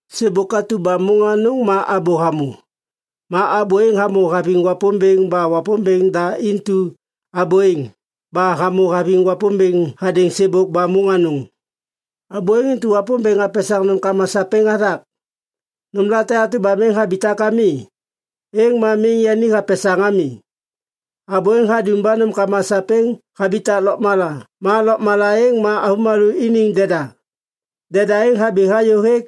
Sêbôk atu ba môŋ anôŋ ma Abô hamô. Ma Abô êŋ hamô haviŋ Wapômbêŋ ba Wapômbêŋ da intu abô êŋ ba hamô haviŋ Wapômbêŋ hadêŋ sêbôk ba môŋ anôŋ. Abô êŋ intu Wapômbêŋ hapesaŋ nômkama sapêŋ hathak. Nômlate atu ba miŋ habitak ami, êŋ ma miŋ yani hapesaŋ ami. Abô êŋ hadum ba nômkama sapêŋ habitak lôkmala. Ma lôkmala êŋ ma avômalô iniŋ deda. Deda êŋ habi hayô hêk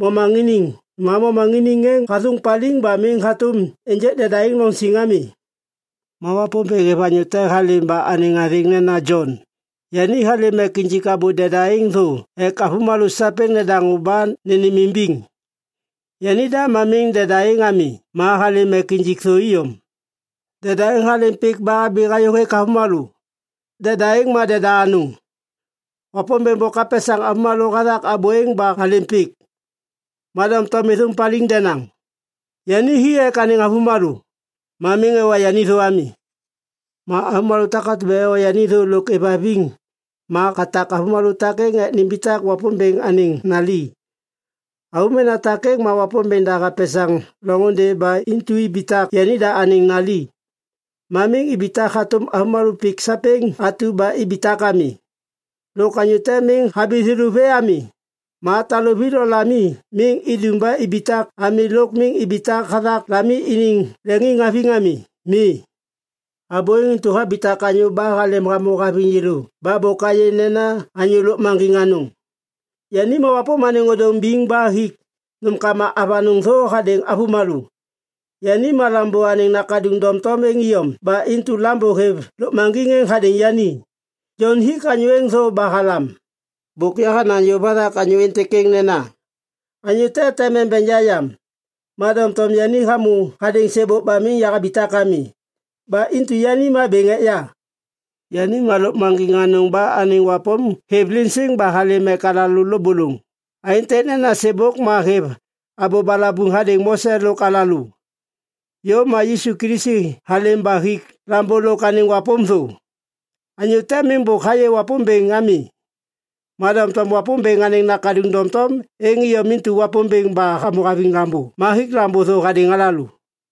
momaŋiniŋ. Ma momaŋiniŋ êŋ hathôŋ paliŋ ba miŋ hatôm ênjêk deda êŋ loŋ siŋ ami. Ma Wapômbêŋ hêv anyô te halêm ba anêŋ athêŋ nena Jon. Yani halêm ek injik Abô deda êŋ thô ek avômalô sapêŋ nedaŋô ba nênêmimbiŋ. Yanida ma miŋ deda êŋ ami ma halêm ek injik thô iyom. Deda êŋ halêm pik ba habi hayô hêk avômalô. Deda êŋ ma deda anôŋ. Wapômbêŋ bôk hapesaŋ avômalô hathak Abô êŋ ba halêm pik. Ma doŋtom êthôŋ paliŋ denaŋ. Yani hi ek anêŋ avômalô, ma miŋ ewa yani thô ami. Ma avômalô takatu ba ewa yani thô lôk êvhaviŋ ma hatak avômalô takêŋ ek nimbitak Wapômbêŋ anêŋ nali. Avômena takêŋ ma Wapômbêŋ da hapesaŋ loŋôndê ba intu ibitak yanida anêŋ nali. Ma miŋ ibitak hatôm avômalô pik sapêŋ atu ba ibitak ami. Lôk anyô te miŋ habi thêlô vê ami. Ma taluvi lo lami miŋ idum ba ibitak ami lôk miŋ ibitak hathak lami iniŋ leŋiŋhaviŋ ami. Mi. Abô êŋ intu habitak anyô ba halêm hamô haviŋ yêlô ba bôk ayê nena anyô lôkmaŋgiŋ anôŋ. Yani ma wapôm anêŋ ôdôŋ biŋ ba hik nômkama avanôŋ thô hadêŋ avômalô. Yani ma Lambô anêŋ Nakaduŋ doŋtom êŋ iyom ba intu Lambô hêv lôkmaŋgiŋ êŋ hadêŋ yani. Jon hik anyô êŋ thô ba halam, “Bôk yahanaŋ yôv hathak anyô êntêk êŋ nena, ‘Anyô te tem embeŋ ya yam. Ma doŋtom yani hamô hadêŋ sêbôk ba miŋ yahabitak ami. Ba intu yani ma bêŋ ek ya.’” Yani ma lôkmaŋgiŋ anôŋ ba anêŋ wapôm hêv liŋ siŋ ba halêm ek alalô lôbôlôŋ aêntêk nena sêbôk ma hêv abô balabuŋ hadêŋ Mose lôk alalô. Yôv ma Yisu Kilisi halêm ba hik Lambô lôk anêŋ wapôm thô. Anyô te miŋ bôk hayê Wapômbêŋ ami. Ma doŋtom Wapômbêŋ anêŋ Nakaduŋ doŋtom êŋ iyom intu Wapômbêŋ ba hamô haviŋ Lambô ma hik Lambô thô hadêŋ alalô.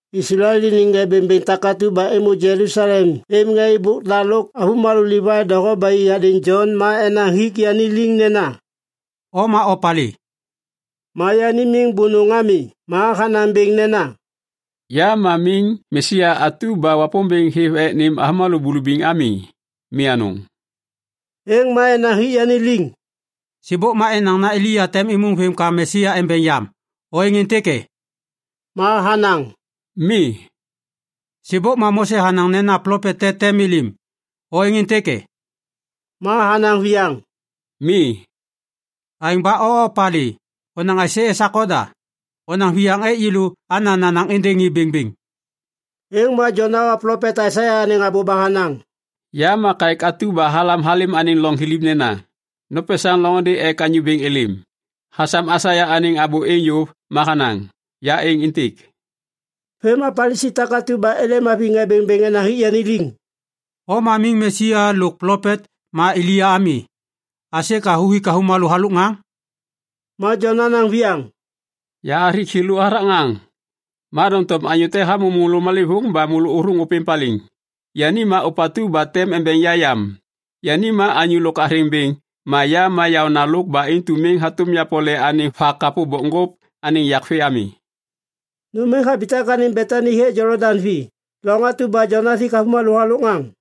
Islael iniŋ ŋê bêŋbêŋ takatu ba êmô Jelusalem êv ŋê êbôk da lôk avômalô Livai doho ba i hadêŋ Jon ma enaŋ hik yani liŋ nena, “O ma opalê?” Ma yani miŋ bônôŋ ami ma hanaŋ bêŋ nena, “Ya ma miŋ Mesia atu ba Wapômbêŋ hêv ek nêm avômalô bulubiŋ ami. Mi anôŋ.” Êŋ ma enaŋ hik yani liŋ, “Sêbôk ma enaŋ nena Elia tem êmôŋ vêm ka Mesia embeŋ yam. O êŋ êntêk e?” Ma hanaŋ, “Mi.” “Sêbôk ma Mose hanaŋ nena plopet te tem êlêm. O êŋ êntêk e?” Ma hanaŋ viyaŋ, “Mi.” “Aêŋ ba o opalê? Onaŋ aisê esak oda? Onaŋ viyaŋ ek yêlô ana nanaŋ êndêŋ ŋê bêŋbêŋ.” Êŋ ma Jon hawa plopet Aisaia anêŋ abô ba hanaŋ, “Ya ma kaêk atu ba halam halêm anêŋ loŋ thiliv nena, ‘Nopesaŋ loŋôndê ek Anyô Bêŋ êlêm.’” Hasam Aisaia anêŋ abô êŋ yôv ma hanaŋ, “Ya êŋ êntêk.” Vêm ma Palisi takatu ba êlêm haviŋ ŋê bêŋbêŋ enaŋ hik yani liŋ, “O ma miŋ Mesia lôk plopet ma Elia ami. Aisê ka huthik avômalô halôk ŋaŋ?” Ma Jon hanaŋ viyaŋ, “Yahathik thêlô hathak ŋaŋ, ma doŋtom anyô te hamô môlô malêvôŋ ba môlô ôthôŋ ôpêŋ paliŋ. Yani ma ôpatu ba tem embeŋ ya yam. Yani ma anyô lôk athêŋ bêŋ ma ya ma yaônalôk ba intu miŋ hatôm yapole anêŋ vakapô bokŋgôp anêŋ yak vê ami.” Nôm êŋ habitak anêŋ Betani hêk Jolodaŋ vi, loŋ atu ba Jon hathak hathik avômalô halôk ŋaŋ.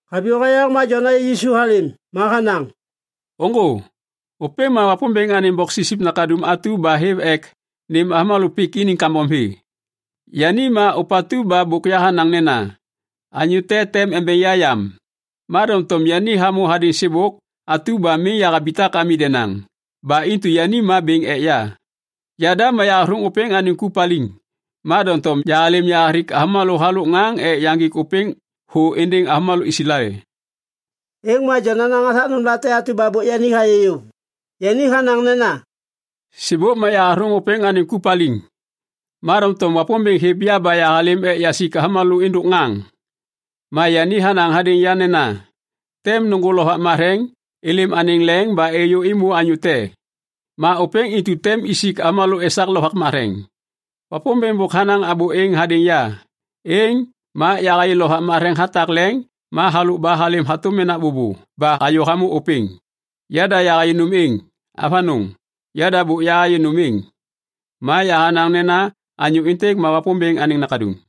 Haviyô hayaŋ ma Jon hayê Yisu halêm. Ma hanaŋ, “Ôŋgô, ôpêŋ ma Wapômbêŋ anêŋ Boksipsip Nakaduŋ atu ba hêv ek nêm avômalô pik iniŋ kambom vê. Yani ma ôpatu ba bôk yahanaŋ nena, ‘Anyô te tem embeŋ ya yam. Ma doŋtom yani hamô hadêŋ sêbôk atu ba miŋ yahabitak ami denaŋ. Ba intu yani ma bêŋ ek ya.’ Yada ma yahathôŋ ôpêŋ anêŋ ku paliŋ. Ma doŋtom yahalêm yahathik avômalô halôk ŋaŋ ek yaŋgik ôpêŋ thô êndêŋ avômalô Islael.” Êŋ ma Jon hanaŋ hathak nômlate atu ba bôk yani hayê yôv. Yani hanaŋ nena, “Sêbôk ma yahathôŋ ôpêŋ anêŋ ku paliŋ. Ma doŋtom Wapômbêŋ hêv ya ba yahalêm ek yasik avômalô êndôk ŋaŋ. Ma yani hanaŋ hadêŋ ya nena, ‘Tem nôŋgô Lovak Matheŋ êlêm anêŋ leŋ ba êyô êmô anyô te. Ma ôpêŋ intu tem isik avômalô esak Lovak Matheŋ.’ Wapômbêŋ bôk hanaŋ abô êŋ hadêŋ ya. Êŋ ma yahayê Lovak Matheŋ hatak leŋ ma halôk ba halêm hatôm menak bôbô ba hayô hamô ôpêŋ. Yada yahayê nôm êŋ. Avanôŋ! Yada bôk yahayê nôm êŋ. Ma yahanaŋ nena anyô êntêk ma Wapômbêŋ anêŋ Nakaduŋ.”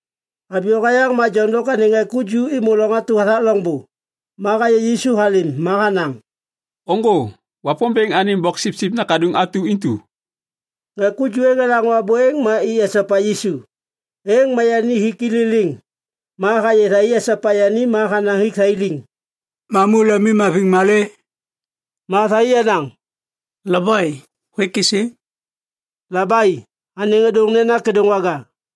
Haviyô hayaŋ ma Jon lôk anêŋ ŋê ku ju êmô loŋ atu hathak loŋbô. Ma hayê Yisu halêm ma hanaŋ, “Ôŋgô, Wapômbêŋ anêŋ Boksipsip Nakaduŋ atu intu.” Ŋê ku ju êŋ elaŋô abô êŋ ma i esopa Yisu. Êŋ ma yani hik i liliŋ ma hayê thai esopa yani ma hanaŋ hik thai liŋ, “Mamu lemimhaviŋ malê?” Ma thai enaŋ, “Labai, hôêk êsê?” (“Labai” anêŋ ôdôŋ nena “Kêdôŋwaga”.)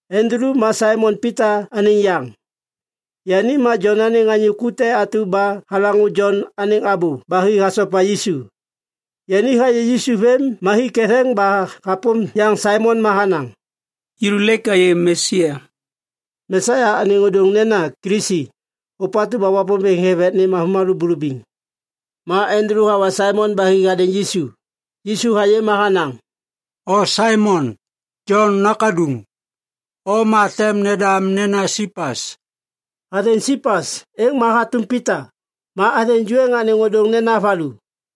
Andulu ma Saimon Pita anêŋ yaŋ, yani ma Jon anêŋ anyô ku te atu ba halaŋô Jon anêŋ abô ba hi hasopa Yisu. Yani hayê Yisu vêm ma hi ketheŋ ba hapôm yaŋ Saimon ma hanaŋ, “Yêlô lêk ayê Mesia.” (Mesia anêŋ ôdôŋ nena “Kilisi, ôpatu ba Wapômbêŋ hêv ek nêm avômalô bulubiŋ”.) Ma Andulu hawa Saimon ba hi hadêŋ Yisu. Yisu hayê ma hanaŋ, “O Saimon, Jon nakaduŋ. O ma tem nendam nena Sipas.” (Athêŋ “Sipas” êŋ ma hatôm “Pita”. Ma athêŋ ju êŋ anêŋ ôdôŋ nena “valu”.)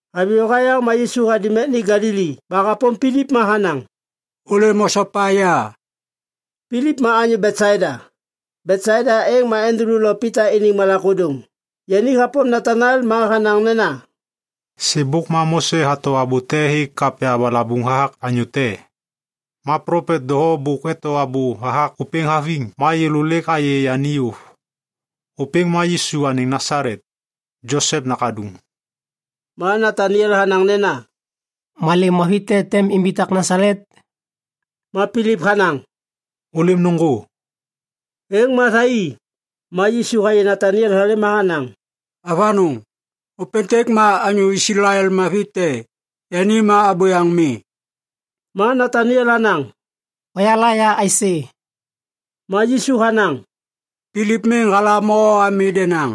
Haviyô hayaŋ ma Yisu hadum ek ni Galili ba hapôm Pilip ma hanaŋ, “Ôlêm osopa ya.” Pilip ma anyô Betsaida. Betsaida êŋ ma Andulu lo Pita iniŋ malak ôdôŋ. Yani hapôm Nataniel ma hanaŋ nena, “Sêbôk ma Mose hato abô te hêk kapya balabuŋ hathak anyô te. Ma plopet doho bôk eto abô hathak ôpêŋ haviŋ. Ma yêlô lêk ayê yani yôv. Ôpêŋ ma Yisu anêŋ Nasalet, Josep nakaduŋ.” Ma Nataniel hanaŋ nena, “Malê mavi te tem imbitak Nasalet?” Ma Pilip hanaŋ, “Ôlêm nôŋgô.” Êŋ ma thai i. Ma Yisu hayê Nataniel halêm ma hanaŋ, “Avanôŋ! Ôpêntêk ma anyô Islael mavi te. Yani ma abôyaŋ mi.” Ma Nataniel hanaŋ, “Hoyala ya aisê?” Ma Yisu hanaŋ, “Pilip miŋ halam o ami denaŋ.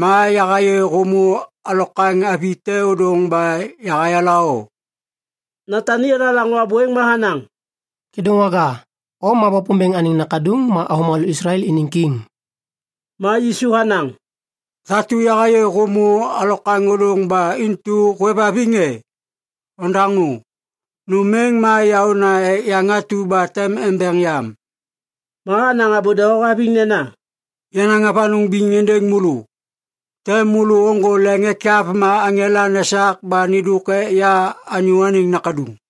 Ma yahayê hômô alokwaŋ avi te ôdôŋ ba yahayala o.” Nataniel halaŋô abô êŋ ma hanaŋ, “Kêdôŋwaga, o ma Wapômbêŋ anêŋ Nakaduŋ ma avômalô Islael iniŋ Kiŋ.” Ma Yisu hanaŋ, “Thatu yahayê hômô alokwaŋ ôdôŋ ba intu hôêvhaviŋ e? Ondaŋô! Nôm êŋ ma yaôna ek yaŋ atu ba tem embeŋ yam.” Ma hanaŋ abô doho haviŋ nena, “Yanaŋ avanôŋ biŋ êndêŋ môlô. Tem môlô ôŋgô leŋ ekyav ma aŋela nesak ba nêndôk ek ya Anyô Anêŋ Nakaduŋ.”